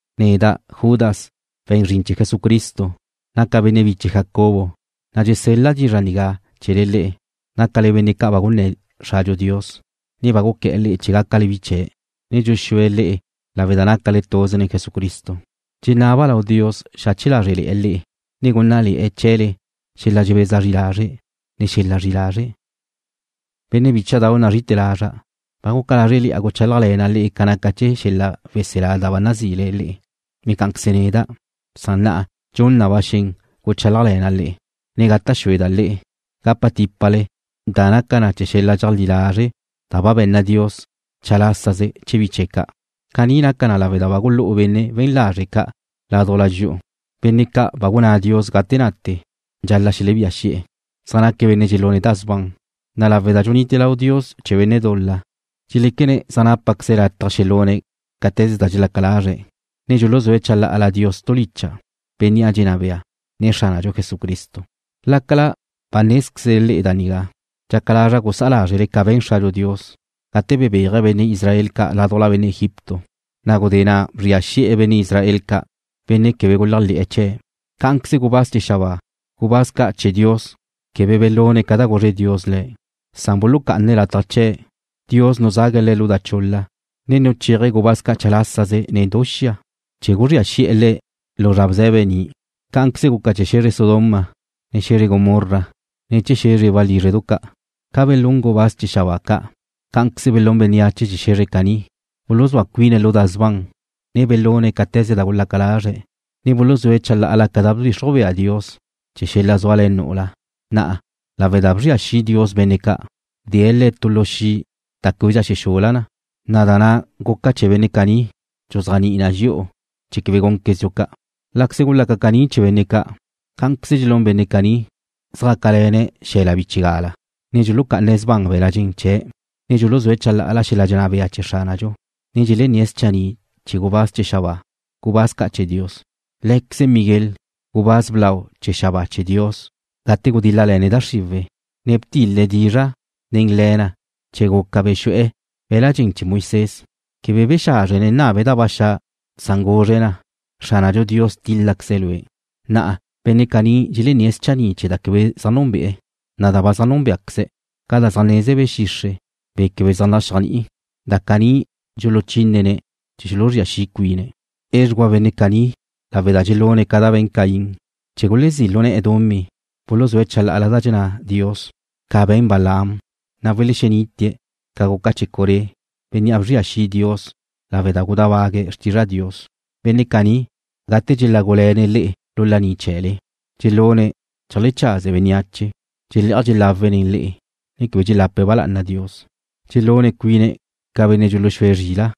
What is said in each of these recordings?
Neda', Judas, we̱n zrin chee̱ Jesucristo, naca' benne' biche Jacobo, na' dxesel-la' dizra' nigá chee̱le le'e, nácale benne' ca' ba gunné̱ Xradxu Dios, ne ba guqué̱'e̱ le'e chee̱ gácale bi chee̱', ne dxuxúe̱' le'e lawe' da nácale tuze nen Jesucristo. Dxenaba' lau Dios xache lázrele̱'e̱ le'e, ne gúnnale̱'e̱ chee̱le xel-la' dxebeza zri lazre', ne xel-la' zri'i lazre'. Benne' bícha'dau' nazri'ite̱ lazra', ba guca lázreli'a guchálajle̱na' le'e ca naca chee̱ xel-la' weselá da ba nazile le'e, ne cá'anqueze neda', san na'a dxun na ba xen guchálajle̱na' le'e, ne gata' xueda' le'e gapa típale da naca chee̱ xel-la' dxeajlí lazre' da ba be̱nna Dios chalásaze chee̱ bi chee̱' ca'. Caní naca lawe' da ba gulú'u benne' we̱n lazre' ca' ládujla dxi'u, benne' ca' ba gunná Dios gate nate dxal-la' xelebía xi'e̱. Zaj naque̱' benne' dxelune̱' da sban, na' lawe' da dxunite lau Dios chee̱ benne' dul-la, dxeléquene̱' zaj nápaqueze̱' lataj xelune̱' cáte̱ze da dxelaca lazre̱', ne dxuluzúe̱' chalá'ala Dios tu licha', Bénnea' dxenná bea, ne Xránadxu Jesucristo. Lácala ba nézquezle le'e da nigá, dxaca lazra' gusá'a lázrele ca be̱n Xradxu Dios gate bebéaje̱' benne' Israel ca' ládujla benne' Egipto, na' gudé na' bzria xi'e̱ benne' Israel ca', benne' quebe guléajle̱'e̱ chee̱'. Cá'anqueze gubáz chee̱ xabáa, gubáz ca' chee̱ Dios, quebe belune̱' ca da guzre Dios le̱', san bulucá'ane̱' lataj chee̱'. Dios nuzague̱' le̱' lu da chul-la, ne nuchéaje̱' gubáz ca' chalásaze nen du xia, chee̱ guzría xi'e̱ le̱' lu zra bze̱be ni'. Cá'anqueze guca chee̱ xe̱zre Sodoma, ne xe̱zre Gomorra ne chee̱ xe̱zre walízredu ca'. Ca belún gubáz chee̱ xabáa ca', cá'anqueze belún bénneache chee̱ xe̱zre caní. Buluzúa cuine̱' lu da sban, ne belune̱' cáte̱ze da gulaca lazre̱', ne buluzúe̱' chalá'ala ca da bdxixruj bea Dios chee̱ xel-la' zúale̱ nu'ula. Na'a, lawe' da bzria xi' Dios benne' ca', bdee̱' le̱' tu lu xi' da québedxa xexula na, na' da na' guca chee̱ benne' caní dxuzéajni'i na dxi'u chee̱ quebe gúnquezdxu ca'. Láqueze gulaca caní chee̱ benne' ca', cá'anqueze dxelún benne' caní, zjácale̱ne̱' xel-la' bchigala, ne dxuluca'ane̱' sban be̱la' dxen chee̱', ne dxuluzúe̱' chalá'ala xel-la' dxenná bea chee̱ Xránadxu, ne dxelenné̱' schanni' chee̱ gubáz chee̱ xabáa, gubáz ca' chee̱ Dios. Lé̱queze Miguel, gubáz blau chee̱ xabáa chee̱ Dios gate gudíl-lale̱ne̱' da xriwe̱', ne btil-le̱' dizra' nen le̱ na chee̱ guca bexu'e̱ be̱l-la' dxen chee̱ Moisés, quebe bexázrjene̱' nnabe̱' da ba xa', san guzre̱' na: “Xránadxu Dios tíl-laqueze̱' lue'.” Na'a benne' caní dxelenné̱' schanni' chee̱ da quebe zaj núnbe'e̱, na' da ba zaj núnbeaqueze̱', ca da zaj neze be̱ xixre', be̱ quebe zaj naxéajni'iba', da caní dxuluchínene̱' chee̱ xuluzría xi' cuine̱'. Edxugua benne' caní lawe' da dxelune̱' ca da be̱n Caín, chee̱ gulezí' lu ne̱'e̱ dumí, buluzúe̱' chalá'ala da dxenná Dios ca be̱n Balaam, na' welexenite̱' ca guca chee̱ Coré, bénnea' bzria xi' Dios lawe' da gudábague̱' xrtizra Dios. Benne' caní, gate dxelágule̱ne̱' le'e lu laní chee̱le dxelune̱' cheajlechaze bénneache. Dxelé'aj dxelawe̱' nen le'e, ne quebe dxelape̱' ba lá'ana Dios. Dxelún cuine̱' ca benne' dxuluxúe̱' zrila',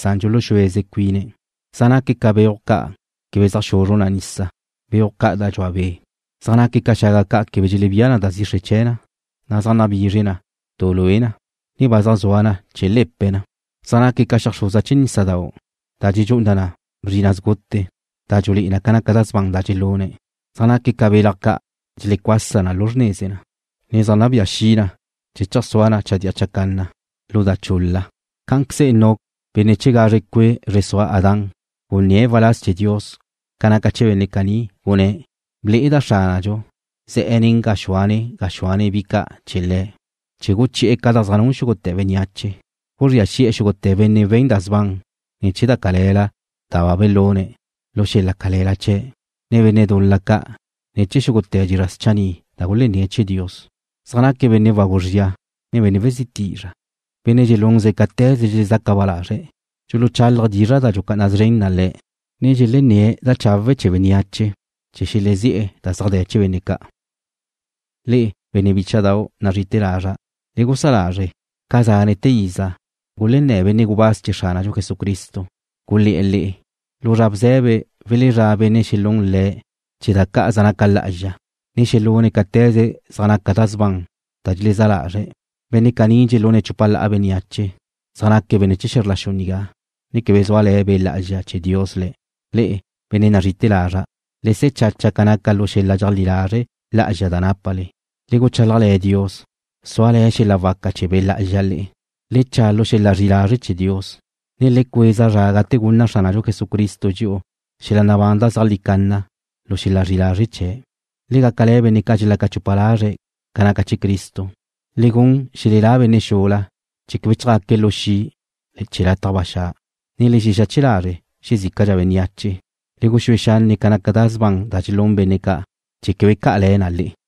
san dxuluxúeze cuine̱'. Zaj naque̱' ca beuj ca' quebe zaj xuzru nisa, beuj ca' da dxua be'. Zaj naque̱' ca xaga ca' quebe dxelebía na da zixre chee̱ na, ne zaj nabizre na du lue na, ne ba zaj zua na chee̱ le̱pe na. Zaj naque̱' ca xeajxruza chee̱ nísadau' da dxedxú'u na bzrina' sgute, da dxulé'e na ca da sban da dxelune̱'. Zaj naque̱' ca belaj ca' dxelecuasa na lu xrneze na, ne zaj nabía xi na chee̱ cheajsúa na chadía chacanna lu da chul-la. Cá'anqueze Enoc, benne' chee̱ gazre cue' zre sua Adán gunné̱' waláz chee̱ Dios ca naca chee̱ benne' caní, gunné̱': “Ble'eda' Xránadxu ze̱'e̱ nen gaxúane gaxúane bi chee̱ ca' chee̱ guchi'e̱ ca da zaj nun xúgute̱ bénneache. Gulezría xi' xúgute̱ benne' we̱n da sban ne̱ chee̱ da cale̱la da belune̱' lu xel-la' cale̱la chee̱', nen benne' dul-la ca' ne̱ chee̱ xúgute̱ dizra' schanni' da gulenné̱ chee̱ Dios.” Zaj naque̱' benne' wagu zria, ne benne' wezí tizra', benne' dxelunze̱' cáte̱ze dxelezaca ba lazre̱'. Dxuluchálaje̱' dizra' da dxucá'ana szren na le̱', ne dxelennáze̱' da chawe' chee̱ bénneache chee̱ xelezí'e̱ da zaj de̱ chee̱ benne' ca'. Le'e, benne' bícha'dau' nazri'ite̱ lazra', le gusá lázrele ca zánete̱ iza gulenná benne' gubáz chee̱ Xránadxu Jesucristo, gulé̱'e̱ le'e: Lu zra bze̱be welezrá' benne' xelún le̱' chee̱ da ca' zaj naca lá'azxa, ne xelune̱' cáte̱ze zaj naca da sban da dxelezá lazre̱'. Benne' caní dxelune̱' chupa la'a bénneache. Zaj naque̱' benne' chee̱ xe̱zr la xu nigá, ne quebe zúale̱ Be' Lá'azxa chee̱ Dios le̱'. Le'e, benne' nazri'ite̱ lazra', le se̱ chacha ca naca lu xel-la' dxeajlí lazre' lá'azxa da nápale. Le guchálajle̱ Dios, zúale̱ xel-la' waca chee̱ Be' Lá'azxa le'e. Le cha' lu xel-la' zri'i lazre' chee̱ Dios, ne le cueza zra gate gunna Xránadxu Jesucristo dxi'u xel-la' nabán da zeajlí canna lu xel-la' zri'i lazre' chee̱'. Le gácale̱ benne' ca' dxelaca chupa lazre̱' ca naca chee̱ Cristo. Le gun xelelá benne' xula chee̱ quebe chjaque̱' lu xi' chee̱ lataj ba xa', ne le xexache lazre' xezícala bénneache. Le guxúe xanne' ca naca da sban da dxelún benne' ca' chee̱ quebe ca'a le̱ na le'e.